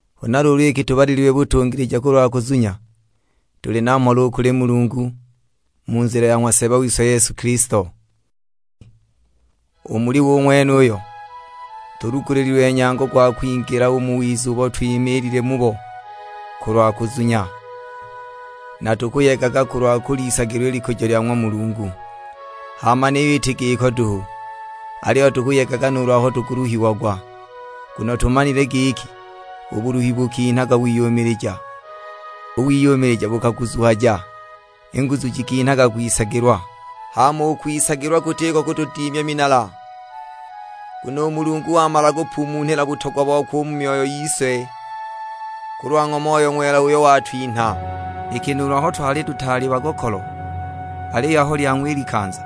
Huna luulu iki tubalililwe butungilija kulwa kuzunya, tuli na mhola u kuli Mulungu, mu nzila ya ng'wa Seeba wise Yesu Kilisto. U muli we u ng'wenuyo, tulugulililwe nyango gwa kwingila u mu wiza ubo twimiilile mubo kulwa kuzunya; na tukuyegaga kulwa kuliisagilwa i likujo lya ng'wa Mulungu. Hama niyo iti giko duhu, aliyo tukuyegaga nuulu aho tukuluhiagwa, nguno tumanile giki u buluhi bukinhaga wiyumilija. U wiyumilija bukaguzuhyaga, i nguzu jikinhaga kwisagilwa. Hama u kwisagilwa kutiko kutudimya minala, nguno u Mulungu wamala kupumunhila butogwa bokwe u mu myoyo yise kulwa ng'wa Moyo Ng'wela uyo watwinha. Iki nuulu aho twali tutaali bagokolo, aliyo aho lyang'wa i likanza,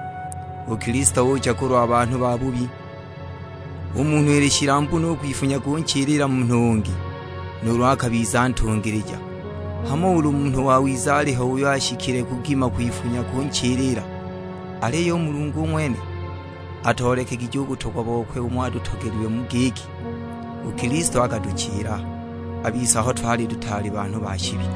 u Kilisto ucha kulwa banhu babubi. U munhu ili shilambu no u kwifunya kunchilila munhu ungi, nuulu akabiza ntungilija; hamo ulu munhu wawiza aliho uyo ashikile kugima kwifunya kunchilila! Aliyo u Mulungu u ng'wene atoolekegije u butongwa bokwe umo atutogelilwe mu giki, u Kilisto akatuchilila a bise aho twali tutaali banhu ba shibi.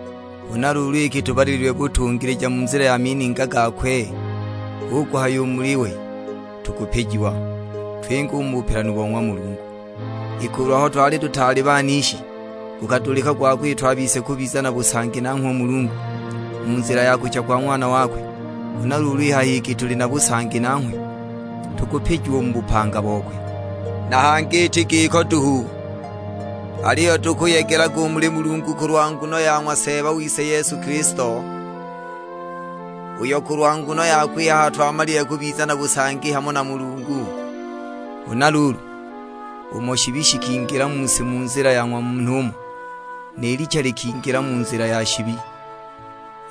Huna luulu iki tubalililwe butungilija mu nzila ya mininga gakwe, hu kuhaya u muli we tukupijiwa, twinge u mu bupelanu bo ng'wa Mulungu. Iki ulu aho twali tutaali banishi gukadulika gwa kwitwa a bise kubiza na busangi nanghwe u Mulungu, mu nzila ya kucha kwa Ng'wana wakwe, huna luulu i haha iki tuli na busangi nanghwe, tukupijiwa u mu bupanga bokwe. Na hangi iti giko duhu, aliyo tukuyegelaga u muli Mulungu kulwa nguno ya ng'wa Seeba wise Yesu Kilisto, uyo kulwa nguno yakwe i haha twamalile kubiza na busangi hamo na Mulungu. Huna luulu, umo shibi shikingilila mu si mu nzila ya ng'wa munhu umo, ni licha likingila mu nzila ya shibi,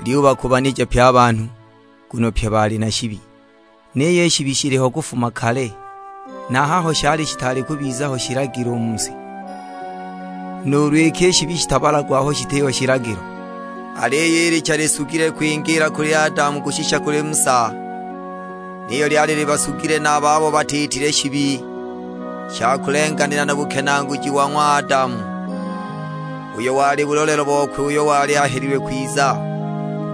lyubakubanija pye a banhu; nguno pye bali na shibi. Niyo i shibi shiliho kufuma kale, na a haho shali shitaali kubiza ho shilagilo u mu si; nuulu iki i shibi shitabalagwa aho shitiho shilagilo. Aliyo i licha lisugile kwingiila kuli Adamu kushisha kuli Musa, niyo lyali libasugile na a babo batiitile shibi sha kulenganila na bukenaaguji bo ng'wa Adamu, uyo wali bulolelo bokwe uyo wali ahelilwe kwiza.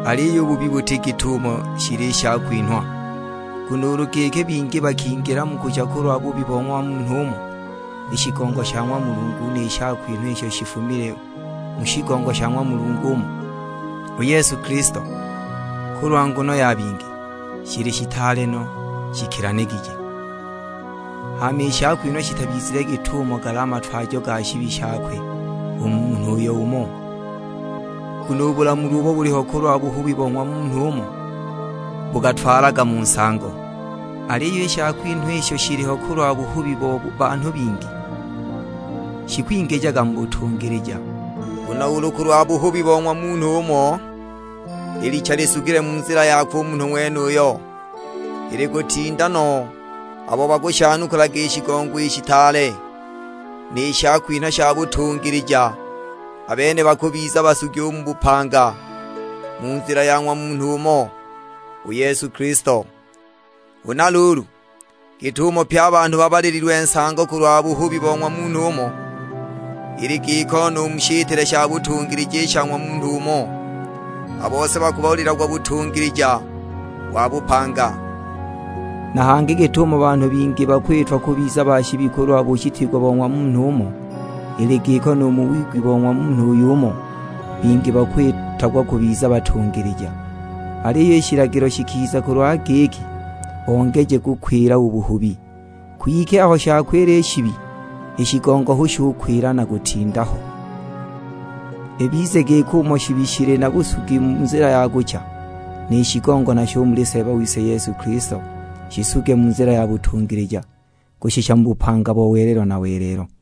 Aliyo u buhubi buti git'umo shili i shakwinhwa; nguno ulu giki bingi bakingila mu kucha kulwa buhubi bo ng'wa munhu umo, i shigongo sha ng'wa Mulungu ni shakwinha isho shifumile mu shigongo sha ng'wa Munhu umo, u Yesu Kilisto, kulwa nguno ya bingi, shili shitaale no shikilanigije. Hama i shakwinhwa shitabizile git'umo gali a matwajo ga shibi shakwe u munhu uyo umo; nguno u bulamulwa ubo buliho kulwa buhubi bo ng'wa munhu umo, bukatwalaga mu nsango; aliyo i shakwinhwa isho shiliho kulwa buhubi bo banhu bingi, shikwingijaga mu butungilija. Nguno ulu kulwa buhubi bo ng'wa munhu umo i licha lisugile mu nzila yakwe u munhu ng'wenuyo, ili kutinda no abo bakushanukulaga i shigongo i shitaale, ni shakwinhwa sha butungilija; a bene bakubiza basugi u mu bupanga, mu nzila ya ng'wa Munhu umo, u Yesu Kilisto. Huna luulu, git'umo pye a banhu babalililwe nsango kulwa buhubi bo ng'wa munhu umo, ili giko nu mu shitile sha butungilija i sha ng'wa Munhu umo, a bose bakubalilagwa butungilija wa bupanga. Na hangi git'umo banhu bingi bakiitwa kubiza ba shibi kulwa bushitiigwa bo ng'wa munhu umo, ili giko nu mu wigwi bo ng'wa Munhu uy'umo, bingi bakwitagwa kubiza batungilija. Aliyo i shilagilo shikiza kulwa giki bongeje kukwila u buhubi; kwike aho shakwila i shibi, i shigongo hu shukwila na kutinda ho. Ibize giki umo shibi shili na busugi mu nzila ya kucha, ni shigongo nasho u muli Seeba wise Yesu Kilisto shisuge mu nzila ya butungilija, kushisha mu bupanga bo welelo na welelo.